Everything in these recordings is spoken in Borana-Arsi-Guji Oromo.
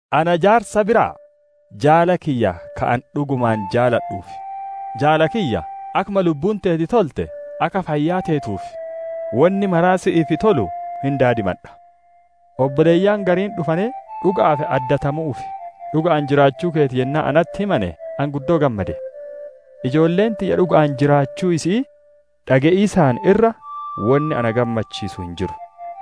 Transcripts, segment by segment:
Ana jaarsa biraa: Jaala kiyya ka ani dhugumaan jaaladhuuf: Jaala kiyya! Akkuma lubbuun teeti tolte, akka fayyaa teetuu fi wonni maraa si'iif tolu hin daadimadha. Obboleeyyan gariin dhufanee dhuga'aaf addatamu'uu fi dhuga'aan jiraachuu keeti yennaa natti himane ani guddoo gammade. Ijoolleen tiyya dhuga'aan jiraachuu isi'ii dhage'iisaan irra wonni na gammachiisu hin jiru.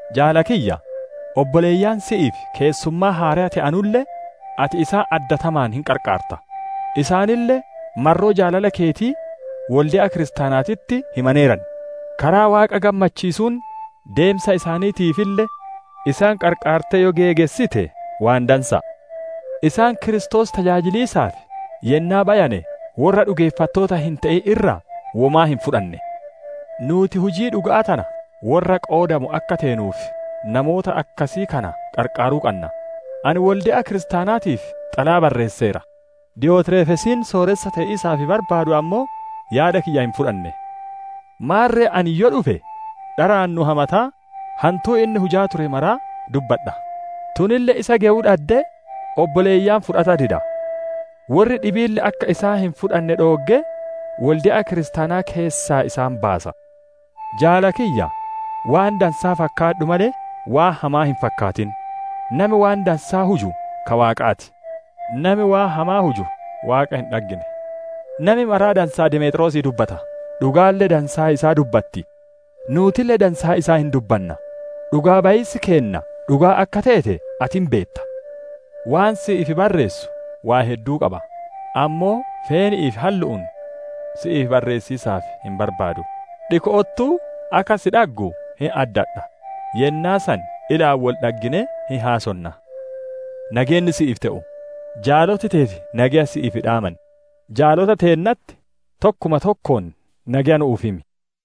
Jaala kiyya! Obboleeyyan si'iif keessummaa haareya te'anulle, ati isaan addatamaan hin qarqaarta. Isaanille marroo jaalala keetii wolde'a kiristaanaatitti himaneeran; karaa Waaqa gammachiisuun deemsa isaaniitiifille isaan qarqaartee yoo geegessite waan dansa'a. Isaan Kiristoos tajaajiliisaaf yennaa bayane, worra dhugeeffattoota hin te'in irraa womaa hin fudhanne. Nuuti hujii dhuga'aa tana worra qoodamu akka teenuuf namoota akkasii kana qarqaaruu qanna. Ani wolde'a kiristaanaatiif xalayaa barreesseera; Diyotreefesiin sooressa te'iisaaf barbaadu ammoo yaada kiyya hin fudhanne. Maarre ani yoo dhufe, dharaan nu hamataa hantuu inni hujaa ture maraa dubbadha; tunille isa gewuu dhaddee obboleeyyan fudhata dida. Worri dhibiille akka isaan hin fudhanne dhooggee, wolde'a kiristaanaa keessaa isaan baasa. Jaala kiyya! Waan dansaa fakkaadhu malee waan hamaa hin fakkaatin. Nami waan dansaa huju ka Waaqaa ti; nami waan hamaa huju Waaqa hin dhaggine. Nami maraa dansaa Demeexroosii dubbata; dhugaalle dansaa isaa dubbatti. Nuutille dansaa isaa hin dubbanna; dhugaa bayiisi keenna dhugaa akka teete ati hin beetta. Waan si'iif barreessu waan hedduu qaba; ammoo feeni'ii fi hallu'uun si'iif barreessiisaaf hin barbaadu. Dhiko'ottuu akka si dhaggu hin addadha; yennaa san ilaan wol dhagginee hin haasonna. Nageenni si'iif te'u. Jaaloti teeti nageya si'iif dhaaman. Jaalota teennatti tokkuma tokkoon nageya nu'uuf himi.